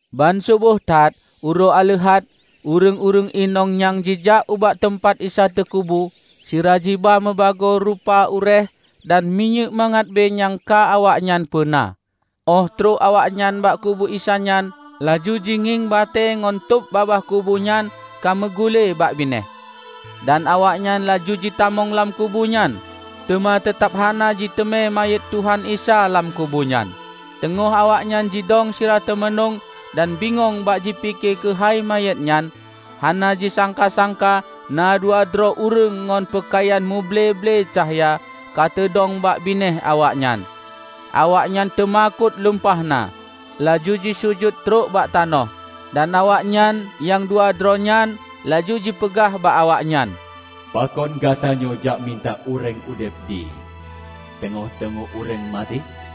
Banseuboh that, uroe Aleuhat, ureuëng-ureuëng inong nyan jijak ubak teumpat Isa teukubu, sira jiba mubagoe rupa uréeh dan minyéuk mangat bée nyang ka awaknyan peuna. Óh troh awaknyan bak kubu Isa nyan, laju jingieng batée ngon tôb babah kubu nyan ka meugule bak binéh. Dan awaknyan laju jitamong lam kubu nyan, teuma teutab hana jiteumé manyét Tuhan Isa lam kubu nyan. Teungoh awaknyan jidong sira teumanueng dan bingong bak jipike keuhai manyét nyan, hana jisangka-sangka na dua droe ureuëng ngon peukayan muble-ble cahya ka teudong bak binéh awaknyan. Awaknyan teumakot lumpah na, laju jisujut trok bak tanoh, dan awaknyan nyang dua droe nyan laju jipeugah bak awaknyan, "Pakon gatanyoe jak mita ureuëng udeb di teungoh-teungoh ureuëng maté?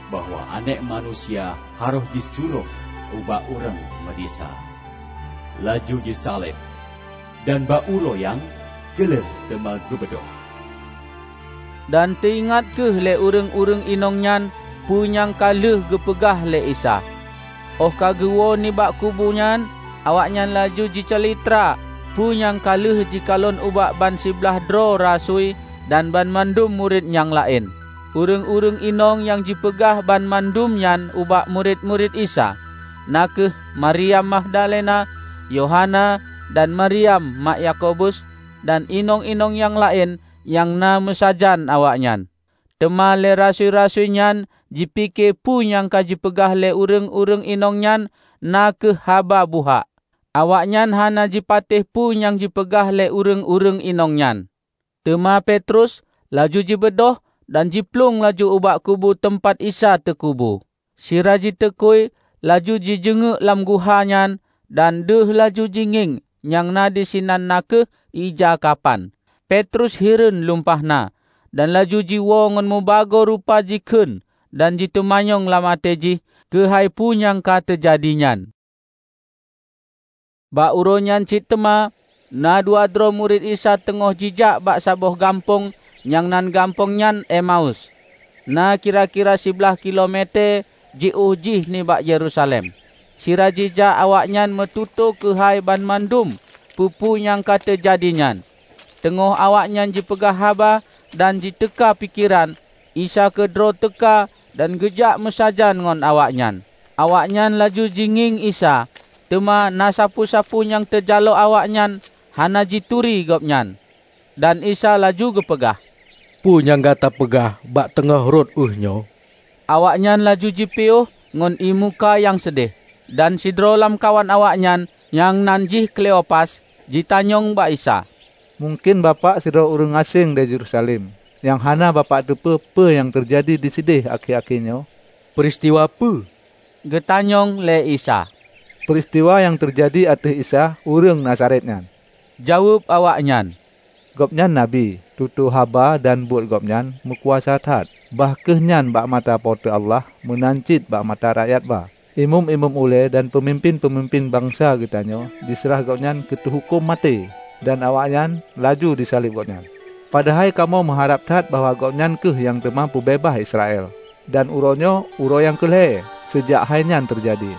bahwa Aneuëk Manusia harôh jiseurah ubak ureuëng meudesya, laju jisaleb, dan bak uroe nyang keu lhée teuma geubeudôh!' " Dan teuingat kheueh lé ureuëng-ureuëng inong nyan peu nyang ka lheueh geupeugah lé Isa. Óh ka geuwoe nibak kubu nyan, awaknyan laju jicalitra peu nyang ka lheueh jikalon ubak ban siblaih droe rasui dan banmandum murit nyang laén. Ureuëng-ureuëng inong nyang jipeugah banmandum nyan ubak murit-murit Isa, na kheueh: Maryam Magdalena, Yohana dan Maryam mak Yakobus, dan inong-inong nyang laén nyang na meusajan awaknyan. Teuma lé rasui-rasui nyan jipike peue nyang ka jipeugah lé ureuëng-ureuëng inong nyan na kheueh haba buhak. Awaknyan hana jipatéh peue nyang jipeugah lé ureuëng-ureuëng inong nyan. Teuma Petrus laju jibeudôh dan jiplueng laju ubak kubu teumpat Isa teukubu. Sira jiteukui laju jijeungeuek lam guha nyan, dan deuh laju jingieng nyang na disinan na kheueh ija kapan. Petrus hireuen lumpah na, dan laju jiwoe ngon mubagoe rupa jikheun dan jiteumanyong lam até jih keuhai peue nyang ka teujadi nyan. Bak uroe nyan cit teuma, na dua droe murit Isa teungoh jijak bak saboh gampông nyang nan gampông nyan Emaus, na kira-kira siblaih kilo metée jiôh jih nibak Yerusalem. Sira jijak awaknyan meututoe keuhai banmandum peue-peue nyang ka teujadi nyan. Teungoh awaknyan jipeugah haba dan jituka pikeran, Isa keudroe teuka dan geujak meusajan ngon awaknyan. Awaknyan laju jingieng Isa, teuma na sapeue-sapeue nyang teujalok awaknyan hana jituri Gobnyan. Dan Isa laju geupeugah, "Peue nyang gata peugah bak teungoh rot ueh nyoe?" Awaknyan laju jipiôh ngon ié muka nyang seudéh. Dan sidroe lamkawan awaknyan, nyang nan jih Kleopas, jitanyong bak Isa, "Mungken bapak sidroe ureuëng aséng di Yerusalem nyang hana bapak teupeue peue nyang ka teujadi disideh akhé-akhé nyoe?" "Peuristiwa peue?" geutanyong lé Isa. "Peuristiwa nyang teujadi ateueh Isa, ureuëng Nazaret nyan," jaweueb awaknyan. "Gobnyan Nabi. Tutoe haba dan buet-buet gobnyan meukuasa that -- bah kheueh nyan bak mata Po teu Allah meunan cit bak mata rakyat ba. Imeum-imeum ulée dan peumimpén-peumimpén bansa geutanyoe jiseurah gobnyan keu teuhuköm maté, dan awaknyan laju jisaleb Gobnyan! Padahai kamoe meuharab that bahwa Gobnyan kheueh nyang teuma peubeubaih Israel! Dan uroenyoe uroe nyang keu lhée seujak hainyan teujadi.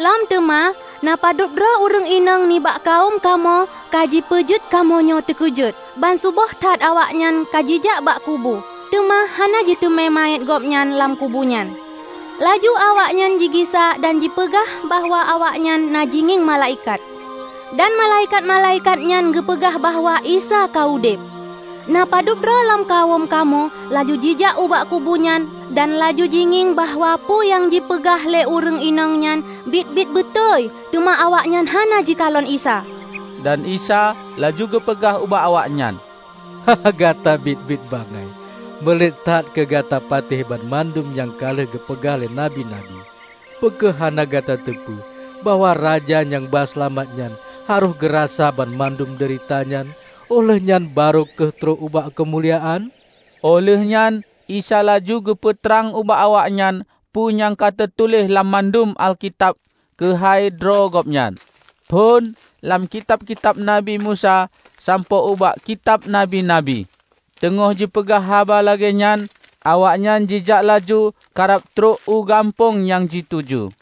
Lom teuma, na padubdroe ureuëng inong nibak kawöm kamoe ka jipeujeuet kamoenyoe teukeujot. Banseuboh that awaknyan ka jijak ubak kubu, teuma hana jiteumé manyét gobnyan lam kubu nyan. Laju awaknyan jigisa dan jipeugah bahwa awaknyan na jingieng malaikat, dan malaikat-malaikat nyan geupeugah bahwa Isa ka udeb. Na padubdroe lam kawöm kamoe laju jijak ubak kubu nyan dan laju jingieng bahwa peue nyang jipeugah lé ureuëng inong nyan biet-biet beutôi, teuma awaknyan hana jikalon Isa." Dan Isa laju geupeugah ubak awaknyan, "Gata biet-biet bangai! Meulet that keu gata patéh banmandum nyang ka lheueh geupeugah lé Nabi-nabi! Peue kheueh hana gata teupeue bahwa Raja nyang ba seulamat nyan harôh geurasa banmandum deurita nyan, óh lheueh nyan barô kheueh trok ubak keumuliaan?" Óh lheuehnyan Isa laju geupeu trang ubak awaknyan peue nyang ka teutuléh lam mandum Alkitab keuhai droe gobnyan, phon lam kitab-kitab Nabi Musa sampoe ubak kitab Nabi-nabi. Teungoh jipeugah haba lagée nyan awaknyan jijak laju karab trok u gampông nyang jituju.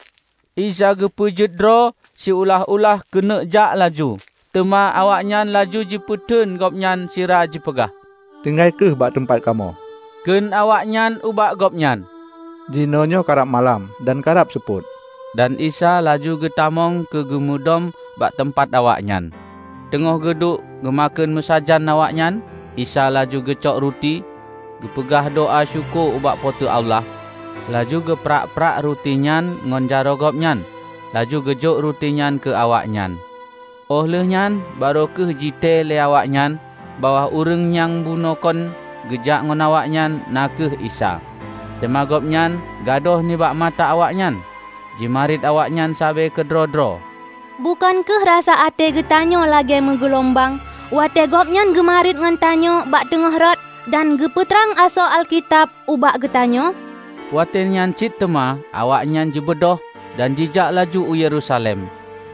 Isa geupeue jeuet droe siulah-ulah keuneuk jak laju, teuma awaknyan laju jipeuteun Gobnyan sira jipeugah. "Tinggai kheueh bak teumpat kamoe," kheun awaknyan ubak Gobnyan, "Jinoenyoe karab malam dan karab seupôt." Dan Isa laju geutamong keu geumudôm bak teumpat awaknyan. Teungoh geuduek geumakheun meusajan awaknyan, Isa laju geucok ruti, geupeugah doá syukoe ubak Po teu Allah, laju geuprah-prah ruti nyan ngon jaroe Gobnyan, laju geujok ruti nyan keu awaknyan. Óh lheueh nyan barô kheueh jitée lé awaknyan bahwa ureuëng nyang bunoekon geujak ngon awaknyan na kheueh Isa. Teuma Gobnyan gadôh nibak mata awaknyan. Jimarit awaknyan sabe keudroe-droe, "Bukon kheueh rasa até geutanyoe lagée meugeulumbang, watée Gobnyan geumariet ngon tanyoe bak teungoh rot, dan geupeu trang asoe Alkitab ubak geutanyoe?" Watée nyan cit teuma awaknyan jibeudôh dan jijak laju u Yerusalem.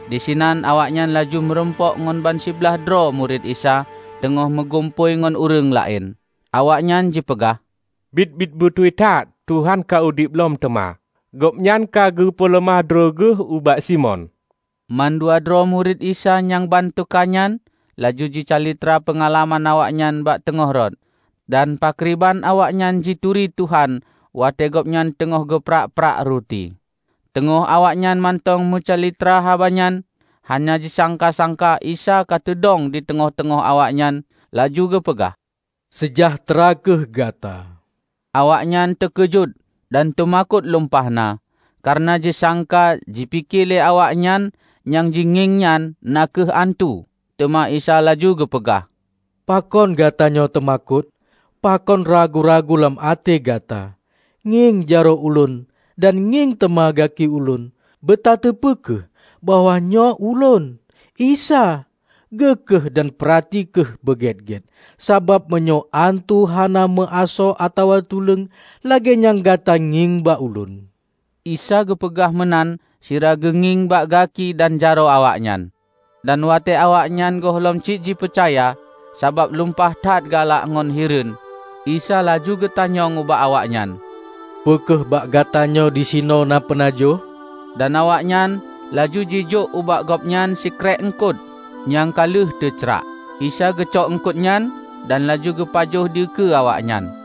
Disinan awaknyan laju meurumpok ngon bansiblaih droe murit Isa teungoh meugumpôi ngon ureuëng laén. Awaknyan jipeugah, "Biet-biet beutôi that Tuhan ka udeb lom teuma! Gobnyan ka geupeuleumah droe geuh ubak Simon!" Mandua droe murit Isa nyang ban teuka nyan laju jicalitra peungalaman awaknyan bak teungoh rot, dan pakriban awaknyan jituri Tuhan watée Gobnyan teungoh geuprah-prah ruti. Teungoh awaknyan mantong meucalitra haba nyan, hana jisangka-sangka Isa ka teudong di teungoh-teungoh awaknyan laju geupeugah, "Seujahteura kheueh gata!" Awaknyan teukeujot dan teumakot lumpah na, kareuna jisangka jipike lé awaknyan nyang jingieng nyan na kheueh antu. Teuma Isa laju geupeugah, "Pakon gatanyoe teumakot? Pakon ragu-ragu lam até gata? Ngieng jaroe Ulôn dan ngieng teuma gaki Ulôn. Beutateupeue kheueh, bahwa nyoe Ulôn, Isa! Geue kheueh dan peurati kheueh beugét-gét, sabab meunyoe antu hana meuasoe atawa tuleueng, lagée nyang gata ngieng bak Ulôn." Isa geupeugah meunan sira geungieng bak gaki dan jaroe awaknyan. Dan watée awaknyan gohlom cit jipeucaya, sabab lumpah that galak ngon hireuen, Isa laju geutanyong ubak awaknyan, "Peu kheueh bak gatanyoe disinoe na peunajoh?" Dan awaknyan laju jijok ubak Gobnyan sikrék eungkot nyang ka lheueh teu cráh. Isa geucok eungkot nyan dan laju geupajoh dikeue awaknyan.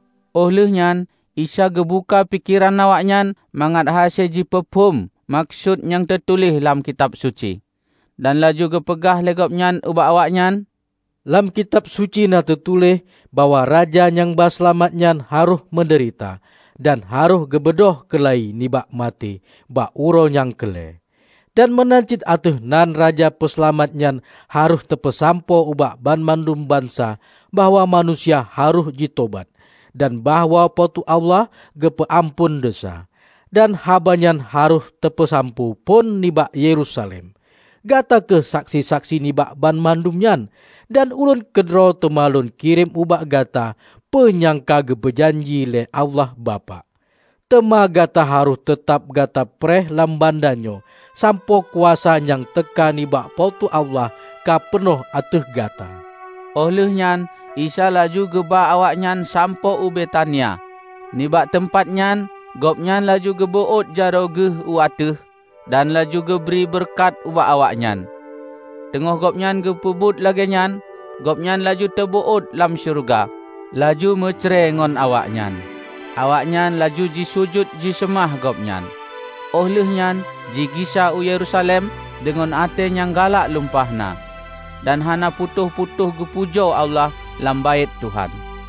Óh lheuehnyan Isa geubuka pikeran awaknyan mangat hase jipeuphôm meukeusut nyang teutuléh lam Kitab Suci. Dan laju geupeugah lé Gobnyan ubak awaknyan, "Lam Kitab Suci na teutuléh bahwa Raja nyang ba Seulamat nyan harôh meudeurita, dan harôh geubeudôh keula-i nibak maté bak uroe nyang keu lhée. Dan meunan cit ateueh nan Raja Peuseulamat nyan harôh teupeusampoe ubak banmandum bansa bahwa manusia harôh jitobat, dan bahwa Po teu Allah geupeu amphon desya. Dan haba nyan harôh teupeusampoe phon nibak Yerusalem. Gata kheueh saksi-saksi nibak banmandum nyan. Dan ulôn keudroe teuma lôn kirém ubak gata peue nyang ka geupeu janji lé Allah Bapak. Teuma gata harôh teutab gata preh lam banda nyoe sampoe kuasa nyang teuka nibak Po teu Allah ka peunoh ateueh gata." Óh lheueh nyan Isa laju geuba awaknyan sampoe u Betania. Nibak teumpat nyan Gobnyan laju geubeuôt jaroe geuh u ateueh, dan laju geubri beureukat ubak awaknyan. Teungoh Gobnyan geupeubuet lagée nyan, Gobnyan laju teubeuôt lam syeuruga, laju meucre ngon awaknyan. Awaknyan laju jisujut jiseumah Gobnyan, óh lheuehnyan jigisa u Yerusalem deungon até nyang galak lumpah na, dan hana putôh-putôh geupujoe Allah lam Baét Tuhan.